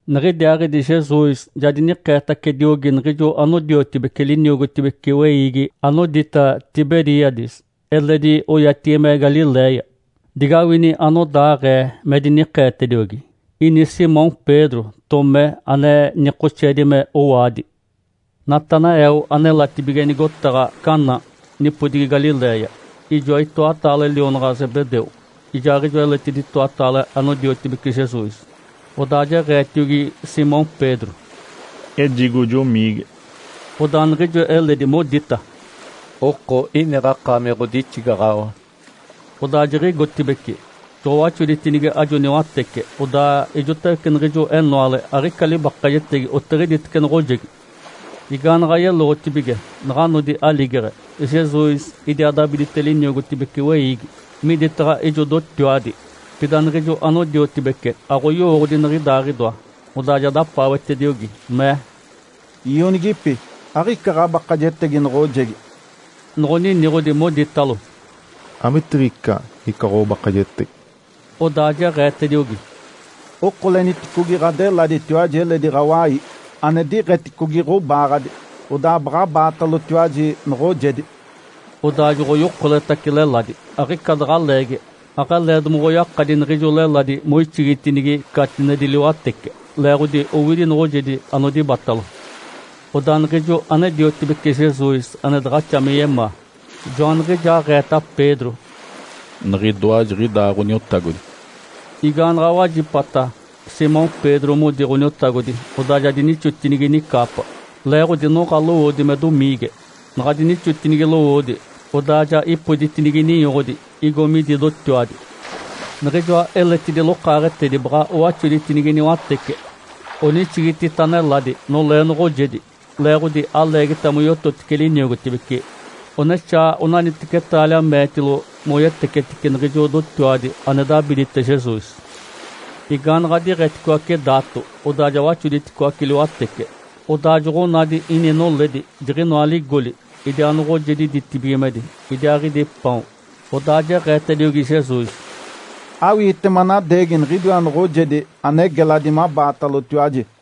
Niɡ̶idiaaɡ̶idi Jesus ja dinikeetacediogi niɡ̶ijo anodiotibece liniogotibece weiigi anodita “Tiberíades” (eledi oyatigi me Galiléia). Digawini anodaaɡ̶ee me dinikeetediogi. Ini Simão Pedro, Tomé ane nikoxeedi me “Owaadi”, Natanael anelatibige nigotaɡ̶a Caná nipodigi Galiléia, ijoa itoataale lionaɡ̶a Zebedeu, ijaaɡ̶ijoa eletidi itoataale anodiotibece Jesus. Odaa jeɡ̶eetiogi Simão Pedro, “Ejigo jomiige”. Odaa niɡ̶ijo eledi modita, “Oko, iniɡ̶a akaami ɡ̶odixigaɡ̶awa”. Odaa jiɡ̶igotibeci, joɡ̶owaxoditinigi ajo niwatece, odaa ijotawece niɡ̶ijo enoale aɡ̶ica libakajetegi otiɡ̶iditece noɡ̶ojegi. Igaanaɡ̶a yeloɡ̶otibige, naɡ̶a nodi aligeɡ̶e, Jesus idiaa dabidite liniogotibece weiigi, miditaɡ̶a ijo dotiwadi. Pida niɡ̶ijo anodiotibece aɡ̶oyowooɡ̶odi niɡ̶idaaɡ̶idoa. Odaa ja dapaawetediogi, mee, “Ionigipi. Aɡ̶ica ɡ̶abakajetegi noɡ̶ojegi?” Noɡ̶oniniɡ̶odi, moditalo, “Amitiɡ̶ica ica ɡ̶obakajetegi”. Odaa jeɡ̶eetediogi, “Okoleniticogi ɡ̶adeladitiwaji eledi ɡ̶awai, ane diɡ̶eticogi ɡ̶obaaɡ̶adi, odaa baɡ̶abaatalotiwaji noɡ̶ojedi”. Odaa joɡ̶oyokoletace leladi. Aɡ̶ica daɡ̶a leegi, aɡ̶alee domoɡ̶oyakadi niɡ̶ijo leladi moixigitinigi catinedi liwatece, leeɡ̶odi owidi noɡ̶ojedi anodibatalo. Odaa niɡ̶ijo ane-diotibece Jesus ane daɡ̶axa me yemaa, joaniɡ̶ijaaɡ̶eeta Pedro, “Niɡ̶idoa jiɡ̶idaa Ǥoniotagodi”. Igaanaɡ̶a wajipata Simão Pedro modi Ǥoniotagodi, odaa ja dinixotinigi nicaapa, leeɡ̶odi noɡ̶a lowoodi me domiige. Naɡ̶a dinixotinigi lowoodi, odaa ja ipoditinigi ninyoɡ̶odi, igo midi dotiwadi. Niɡ̶ijoa eletidi lokaaɡ̶etedi baɡ̶a owaxoditinigi niwatece, onixigitita neladi nolee noɡ̶ojedi, leeɡ̶odi aleegita moyototice liniogotibece, onexaa onaniteci taalia meetilo moyetecetice niɡ̶ijo dotiwadi ane dabidite Jesus. Igaanaɡ̶a diɡ̶etitacicoace daato, odaa ja waxoditicoace liwatece, odaa joɡ̶onadi ini noledi jiɡ̶inoa ligoli, idiaa noɡ̶ojedi ditibigimedi, idiaaɡ̶idi paon. Odaa jeɡ̶eetediogi Jesus, “Awiite manadeegi niɡ̶idiwa noɡ̶ojedi ane geladi mabaatalotiwaji”.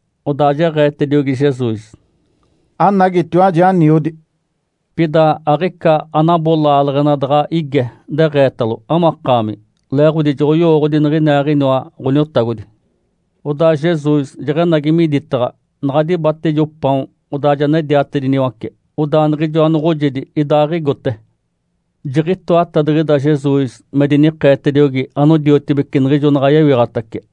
Odaa jeɡ̶eetediogi Jesus, “Anagitiwaji, aniodi”. Pida aɡ̶ica anabo laaleɡ̶ena daɡ̶a ige deɡ̶eetalo, “Amakaami?” Leeɡ̶odi joɡ̶oyowooɡ̶odi niɡ̶iniaaɡ̶iniwa Ǥoniotagodi. Odaa Jesus jeɡ̶enagi miditaɡ̶a, naɡ̶a dibate ijo paon, odaa ja nediatediniwace. Odaa niɡ̶ijoa noɡ̶ojedi idaaɡ̶igote. Jiɡ̶itoatadiɡ̶ida Jesus me dinikeetediogi anodiotibece niɡ̶ijo naɡ̶a yewiɡ̶atace.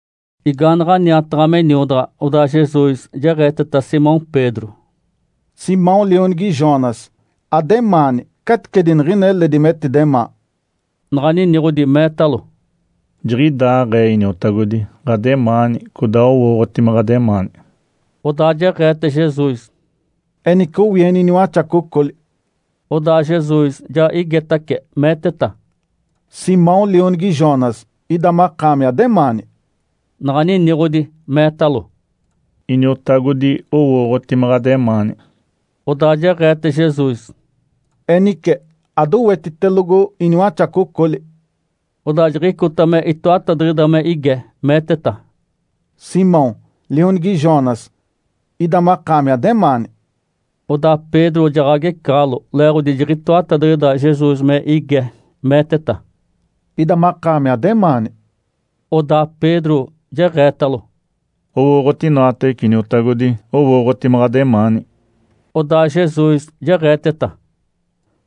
Igaanaɡ̶a niataɡ̶a me niodaɡ̶a, odaa Jesus jeɡ̶eeteta Simão Pedro, “Simão lionigi Jonas, ademaani caticedi niɡ̶ina eledi metidemaa?” Naɡ̶a niniɡ̶odi meetalo, “Jiɡ̶idaaɡ̶ee Iniotagodi, ɡ̶ademaani. Codaa owooɡ̶oti me ɡ̶ademaani”. Odaa jeɡ̶eete Jesus, “Enice, owieni iniwaxacocoli!” Odaa Jesus ja igetace, meeteta, “Simão, lionigi Jonas, ida makaami ademaani?” Naɡ̶a niniɡ̶odi meetalo, “Iniotagodi owooɡ̶oti me ɡ̶ademaani”. Odaa jeɡ̶eete Jesus, “Enice, adowetitelogo iniwaxacocoli!” Odaa jiɡ̶icota me itoatadiɡ̶ida me ige, meeteta, “Simão, lionigi Jonas, ida makaami ademaani?” Odaa Pedro jaɡ̶agecaɡ̶alo leeɡ̶odi jiɡ̶itoatadiɡ̶ida Jesus me ige meeteta, “Ida makaami ademaani?” Odaa Pedro jeɡ̶eetalo, “Owooɡ̶oti inoatawece, Iniotagodi. Owooɡ̶oti me ɡ̶ademaani”. Odaa Jesus jeɡ̶eeteta,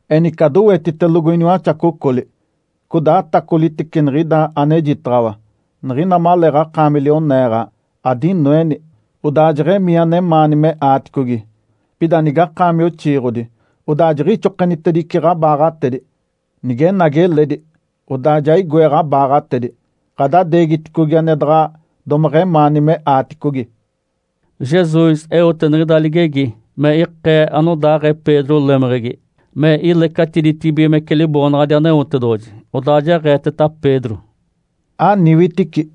“Enice, adowetitelogo iniwaxacocoli! Codaa atacolitece niɡ̶ida anejitaɡ̶awa. Niɡ̶ina maleeɡ̶akaami lioneeɡ̶a, adinoeni, odaa jeɡ̶emii anemaani me aaticogi. Pida nigakaami oxiiɡ̶odi, odaa jiɡ̶ixokenitedice ɡ̶abaaɡ̶atedi. Nigenagi eledi, odaa ja igoe ɡ̶abaaɡ̶atedi, ɡ̶adadeegiticogi ane daɡ̶a domeɡ̶emaani me aaticogi.” Jesus eote niɡ̶ida ligegi me ikee anodaaɡ̶ee Pedro lemeɡ̶egi, me ilecatiditibigimece Liboonaɡ̶adi Aneotedoɡ̶oji. Odaa jeɡ̶eeteta Pedro, “Aniwitici!”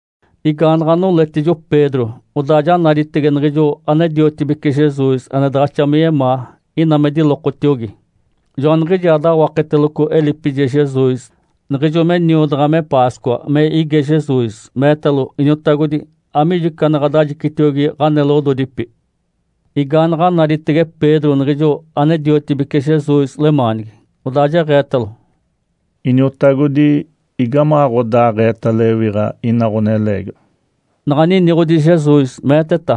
Igaanaɡ̶a noletijo Pedro, odaa ja naditege niɡ̶ijo ane-diotibece Jesus ane daɡ̶axa me yemaa, ina me dilokotiogi. Joaniɡ̶ijaa dawaketeloco elipije Jesus, niɡ̶ijo me niodaɡ̶a me Páscoa me ige Jesus, meetalo, “Iniotagodi, amiijo ica ane ɡ̶adajicitiogi ɡ̶aneloɡ̶ododipi?” Igaanaɡ̶a naditege Pedro niɡ̶ijo ane-diotibece Jesus lemaanigi, odaa jeɡ̶eetalo, “Iniotagodi, igamaɡ̶aɡ̶odaaɡ̶eeta lewiɡ̶a ina ɡ̶oneleegiwa?” Naɡ̶a niniɡ̶odi Jesus, meeteta,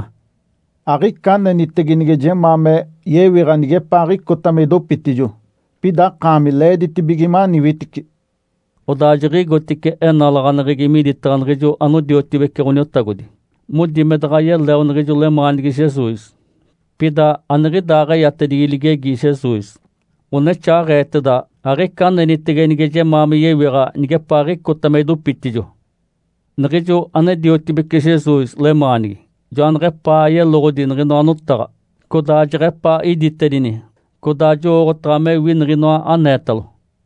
“Aɡ̶ica anenitege nige jemaa me yewiɡ̶a nigepaaɡ̶icota me idopitijo. Pida akaami leeditibige maniwitici!” Odaa jiɡ̶igotice enalaɡ̶aneɡ̶egi miditaɡ̶a niɡ̶ijo anodiotibece Ǥoniotagodi, modi me daɡ̶a yeleo niɡ̶ijo lemaanigi Jesus. Pida aniɡ̶idaaɡ̶eyatedigi ligegi Jesus, onexaaɡ̶eeteda, “Aɡ̶ica anenitege nige jemaa me yewiɡ̶a nigepaaɡ̶icota me idopitijo.” Niɡ̶ijo ane-diotibece Jesus lemaanigi joaneɡ̶epaa yeloɡ̶odi niɡ̶inoa notaɡ̶a, codaa jeɡ̶epaa iditedini, codaa jowooɡ̶otaɡ̶a mewi niɡ̶inoa aneetalo.